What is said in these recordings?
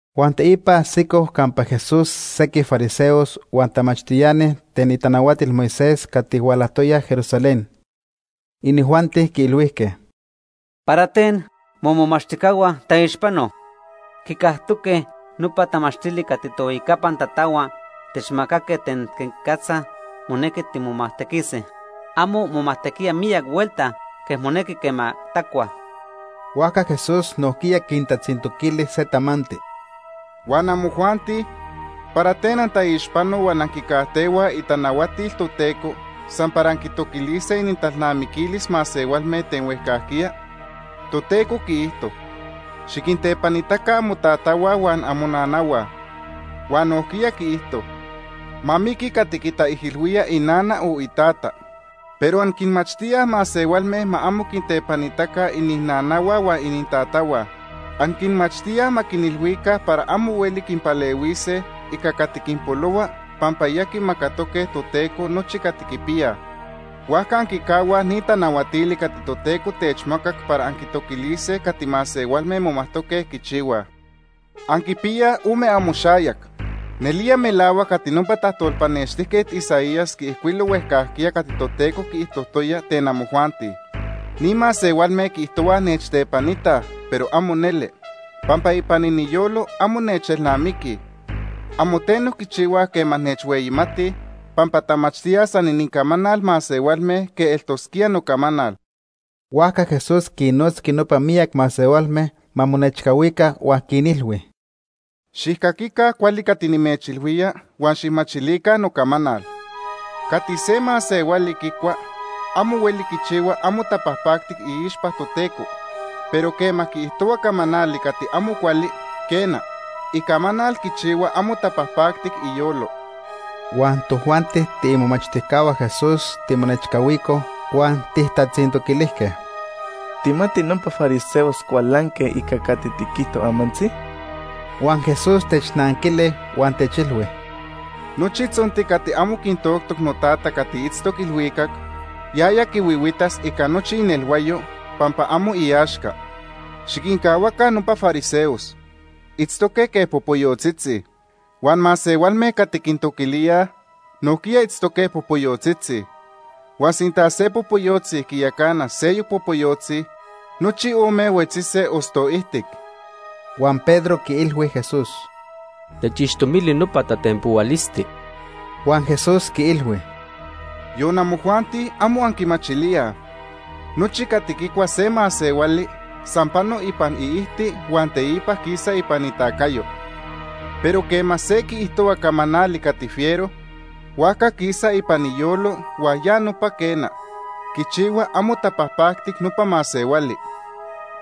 Huan teipa ajsicoj campa Jesús sequij fariseos huan tamachtiani ten itanahuatil Moisés cati hualajtoyaj Jerusalén. Inijuanti quiilhuijque: ―¿Para ten momomachtijcahua taixpanoj? Quicajtoque nopa tamachtili cati tohuejcapan tatahua techmacaque ten quenicatza monequi timomajtequise. Amo momajtequíaj miyac huelta quej monequi quema tacuaj. Huajca Jesús nojquiya quintatzintoquili se tamanti: ―Huan amojuanti ¿para ten antaixpanoj huan anquicajtehuaj itanahuatil Toteco san para anquitoquilise inintalnamiquilis masehualme ten huejcajquiya? Toteco quiijto: ‘Xiquintepanitaca amotatahua huan amonanahua.’ Huan nojquiya quiijto: ‘Ma miqui cati quitaijilhuía inana o itata.’ Pero anquinmachtíaj masehualme ma amo quintepanitaca ininanahua huan inintatahua. Anquinmachtíaj ma quinilhuica para amo hueli quinpalehuise ica cati quinpolohua pampa ya quimacatoque Toteco nochi cati quipiyaj. Huajca anquicahuaj ni tanahuatili cati Toteco techmacac para anquitoquilise cati masehualme momajtoque quichihuase. Anquipiyaj ome amoxayac. Nelía melahuac cati nopa tajtolpanextijquet Isaías quiijcuilo huejcajquiya cati Toteco quiijtojtoya ten amojuanti: ‘Ni masehualme quiijtohuaj nechtepanitaj, pero amo neli, pampa ipan iniyolo amo nechelnamiquij. Amo teno quichihuaj quema nechhueyimatij, pampa tamachtíaj san inincamanal masehualme quej eltosquía nocamanal.’ Huajca Jesús quinnotzqui nopa miyac masehualme ma monechcahuica huan quinilhui: ―Xijcaquica cuali cati nimechilhuía huan xijmachilica nocamanal. Cati se masehuali quicua amo hueli quichihua amo tapajpacti iixpa Toteco, pero quema quiijtohua camanali cati amo cuali, quena, icamanal quichihua amo tapajpactic iyolo. Huan tojuanti tiimomachtijcahua Jesús timonechcahuicoj huan tijtatzintoquilijque: ―¿Tijmati nopa fariseos cualanque ica cati tiquijto amantzi? Huan Jesús technanquili huan techilhui: ―Nochi tzonti cati amo quitoctoc noTata cati itztoc ilhuicac, yaya quihuihuitas ica nochi inelhuayo, pampa amo iaxca. Xiquincahuaca nopa fariseos. Itztoque quej popoyotzitzi. Huan masehualme cati quintoquilíaj nojquiya itztoque popoyotzitzi. Huan sinta se popoyotzi quiyacana seyoc popoyotzi, nochi ome huetzise osto ijtic. Huan Pedro quiilhui Jesús: ―Techixtomili nopa tatenpohualisti. Huan Jesús quiilhui: ―¿Yon amojuanti, amo anquimachilíaj? Nochi cati quicua se masehuali san pano ipan iijti huan teipa quisa ipan itacayo. Pero quema se quiijtohua camanali cati fiero, huajca quisa ipan iyolo huan ya nopa, quena, quichihua amo tapajpactic nopa masehuali.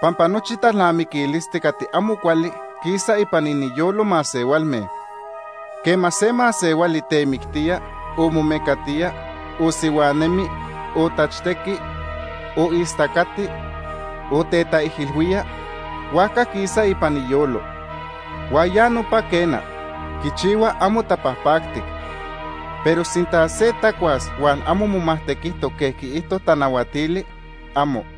Pampa nochi talnamiquilisti cati amo cuali quisa ipan iniyolo masehualme. Quema se masehuali temictía, o momecatía, o sihuanemi, o tachtequi, o istacati, o tetaijilhuía, huajca quisa ipan iyolo. Huan ya nopa, quena, quichihua amo tapajpactic. Pero sinta se tacuas huan amo momajtequijtoc quej quiijto tanahuatili, amo.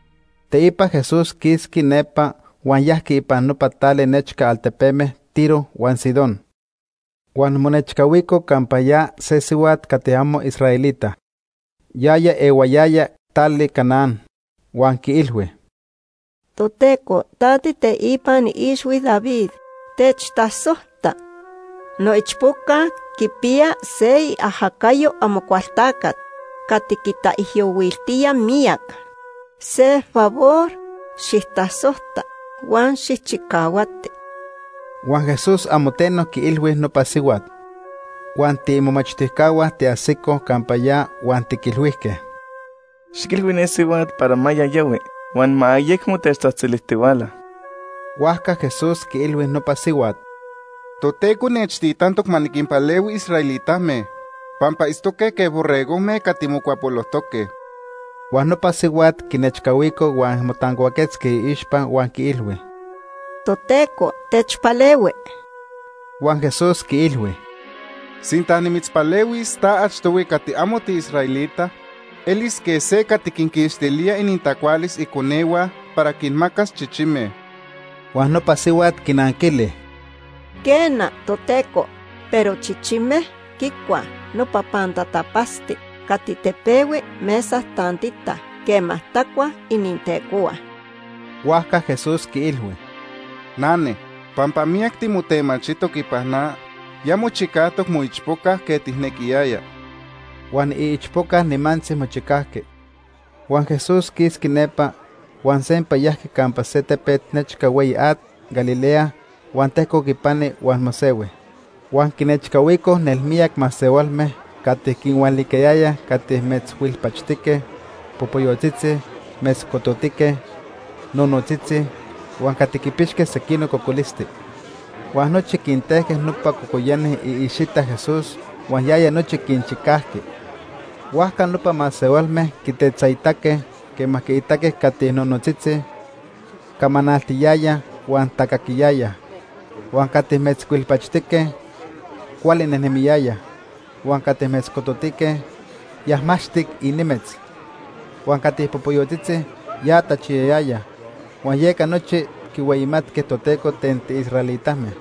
Teipa Jesús quisqui nepa huan yajqui ipan nopa tali nechca altepeme Tiro huan Sidón. Huan monechcahuico campa ya se sihuat cati amo israelita. Yaya ehuayaya tali Canaán, huan quiilhui: ―Toteco, ta tiiteipan ixhui David, techtasojta. Noichpoca quipiya se iajacayo Amocualtacat cati quitaijyohuiltía miyac. Se favor xijtasojta huan xijchicahuati. Huan Jesús amo teno quiilhui nopa sihuat. Huan tiimomachtijcahua tiajsicoj campa ya huan tiquilhuijque: ―Xiquilhui ne sihuat para ma ya yahui huan ma ayecmo techtzajtzilijtihuala. Huajca Jesús quiilhui nopa sihuat: ―Toteco nechtitantoc ma niquinpalehui israelitame, pampa itztoque quej borregojme cati mocuapolojtoque. Huan nopa sihuat quinechcahuico huan motancuaquetzqui iixpa huan quiilhui: ―Toteco, techpalehui. Huan Jesús quiilhui: ―Sinta nimitzpalehuis ta achtohui cati amo tiisraelita, elis quej se cati quinquixtilía inintacualis iconehua para quinmacas chichime. Huan nopa sihuat quinanquili: ―Quena, Toteco, pero chichime quicuaj nopa pantatapatzti cati tepehui mesa tantita quema tacuaj inintecohua. Huajca Jesús quiilhui: ―Nane, pampa miyac timotemachijtoc ipan na, ya mochicajtoc moichpoca quej tijnequiyaya. Huan iichpoca nimantzi mochicajqui. Huan Jesús quisqui nepa, huan sempa yajqui campa se tepet nechca hueyi at Galilea huan tejcoc ipani huan mosehui. Huan quinechcahuicoj nelmiyac masehualme cati quinhualicayayaj cati metzhuilpachtique, popoyotzitzi, metzcototique, nonotzitzi, huan cati quipixque sequinoc cocolisti. Huan nochi quintejque nopa cocoyani iicxita Jesús huan yaya nochi quinchicajqui. Huajca nopa masehualme quitetzaitaque quema quinitaque cati nonotzitzi, camanaltiyayaj huan tacaquiyayaj; huan cati metzhuilpachtique, cuali nejnemiyayaj; huan cati metzcototique, yajmaxtic inimetz; huan cati popoyotzitzi, ya tachiyayayaj; huan yeca nochi quihueyimatque Toteco ten tiisraelitame.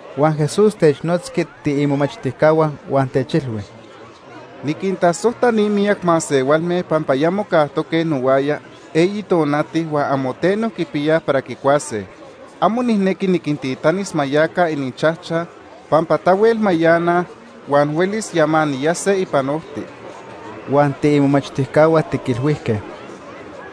Huan Jesús technotzqui tiimomachtijcahua huan techilhui: ―Niquintasojta ni miyac masehualme pampa ya mocajtoque nohuaya eyi tonati huan amo teno quipiyaj para quicuase. Amo nijnequi niquintitanis ma yaca ininchajchaj, pampa tahuel mayanaj huan huelis yamaniyase ipan ojti. Huan tiimomachtijcahua tiquilhuijque: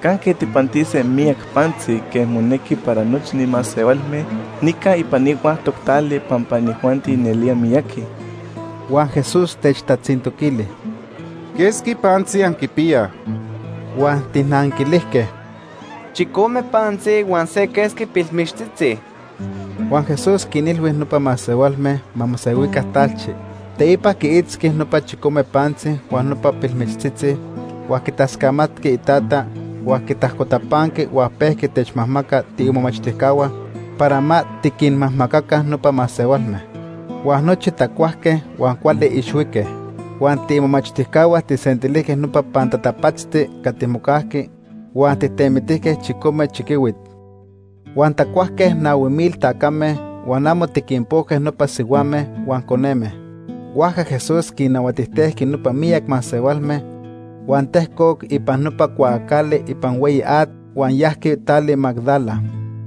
―¿Canque tijpantise miyac pantzi quej monequi para nochi ni masehualme nica ipan ni huactoc tali pampa inijuanti nelía miyaqui? Huan Jesús techtatzintoquili: ―¿Quesqui pantzi anquipiyaj? Huan tijnanquilijque: ―Chicome pantzi huan se quesqui pilmichtzitzi. Huan Jesús quinilhui nopa masehualme ma mosehuica talchi. Teipa quiitzqui nopa chicome pantzi huan nopa pilmichtzitzi huan quitascamatqui Itata huan quitajcotapanqui huan pejqui techmajmaca tiimomachtijcahua para ma tiquinmajmacaca nopa masehualme. Huan nochi tacuajque huan cuali ixhuique. Huan tiimomachtijcahua tijsentilijque nopa pantatapatzti cati mocajqui huan tijtemitijque chicome chiquihuit. Huan tacuajque nahui mil tacame, huan amo tiquinpojque nopa sihuame huan coneme. Huajca Jesús quinnahuatijtejqui nopa miyac masehualme, huan tejcoc ipan nopa cuaacali ipan hueyi at huan yajqui tali Magdala.